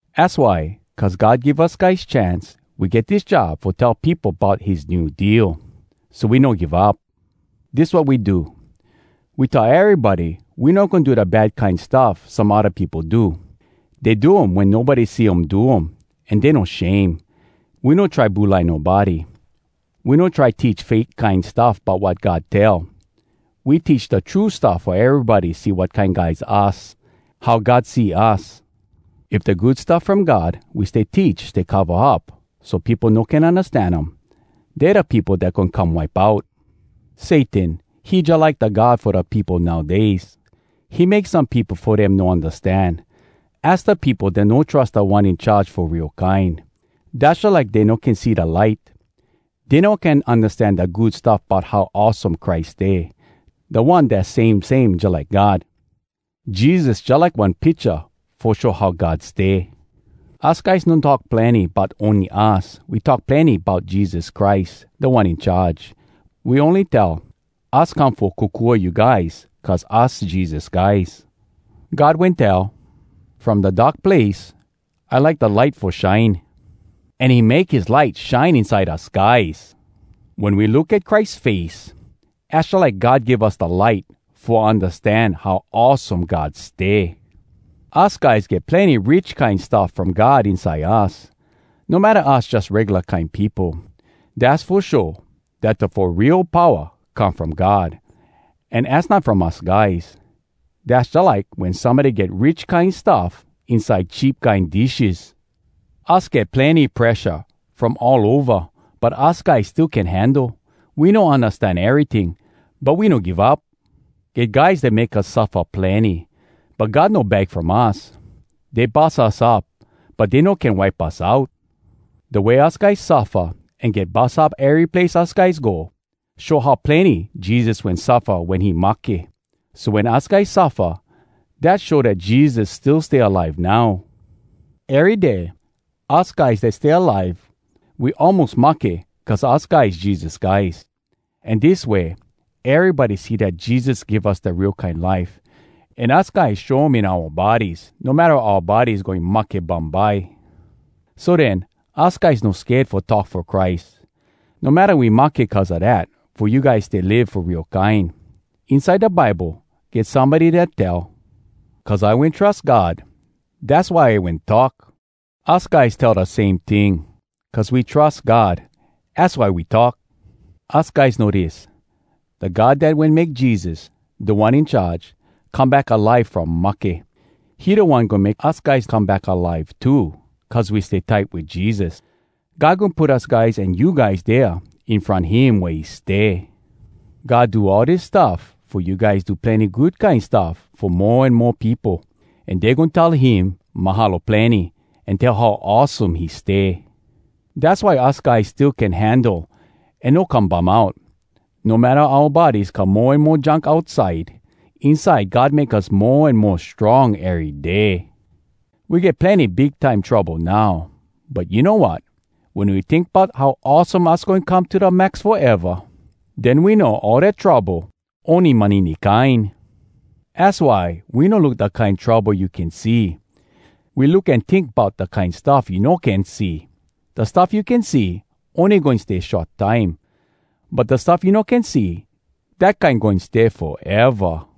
Az why, cuz God give us guys chance, we get dis job fo tell peopo bout his New Deal. So we no give up. Dis wat we do: we tell erybody we no goin do da bad kine stuff some odda peopo do. Dey do um wen nobody see um do, an dey no shame. We no try bulai nobody. We no try teach fake kine stuff bout wat God tell. We teach da true stuff fo erybody see wat kine guys us, how God see us. If da Good Stuff From God we stay teach stay cova up so peopo no can undastan um, dey da peopo dat goin come wipe out. Satan, he jalike da god fo da peopo nowdays. He make some peopo fo dem no undastan. Az da peopo dat no trus Da One In Charge fo real kine. Dass jalike dey no can see da light. Dey no can undastan da Good Stuff bout how awesome Christ stay, da One dass same same jalike God. Jesus jalike one picha fo show how God stay. Us guys no talk plenny bout ony us. We talk plenny bout Jesus Christ, Da One In Charge. We ony tell us come fo kokua you guys cuz us Jesus guys. God wen tell, “From da dark place, I like da light fo shine,” an he make his light shine inside us guys! Wen we look at Christ face, az jalike God give us da light fo undastan how awesome God stay. Us guys get plenny rich kine stuff from God inside us, no matta us jus regula kine peopo. Dass fo show dat da fo real powa come from God, an az not from us guys. Dass jalike wen somebody get rich kine stuff inside cheap kine dishes. Us get plenny presha from all ova, but us guys still can handle. We no undastan eryting, but we no give up. Get guys dat make us suffa plenny, but God no bag from us. Dey bus us up, but dey no can wipe us out. Da way us guys suffa an get bus up ery place us guys go, show how plenny Jesus wen suffa wen he mahke. So wen us guys suffa, dat show dat Jesus still stay alive now. Ery day, us guys dat stay alive, we almos mahke cuz us guys Jesus guys. An dis way erybody see dat Jesus give us da real kine life, an us guys show um in oua bodies no matta oua bodies goin mahke bumbye. So den, us guys no sked fo talk fo Christ, no matta we mahke cuz a dat fo you guys stay live fo real kine. Inside da Bible, get somebody dat tell, “Cuz I wen trus God, dass why I wen talk.” Us guys tell da same ting: Cuz we trus God, az why we talk. Us guys know dis: da God dat wen make Jesus, Da One In Charge, come back alive from mahke, he da One goin make us guys come back alive too cuz we stay tight wit Jesus. God goin put us guys an you guys dea in front him wea he stay. God do all dis stuff fo you guys do plenny good kine stuff fo mo an mo peopo. An dey goin tell him “Mahalo plenny,” an tell how awesome he stay. Dass why us guys still can handle an no come bum out. No matta oua bodies come mo an mo junk outside, inside God make us mo an mo strong ery day. We get plenny big time trouble now, but you know wat? Wen we tink bout how awesome us goin come to da max foeva, den we know all dat trouble ony manini kine! Az why we no look da kine trouble you can see. We look an tink bout da kine stuff you no can see. Da stuff you can see, ony goin stay short time. But da stuff you no can see, dat kine goin stay foeva.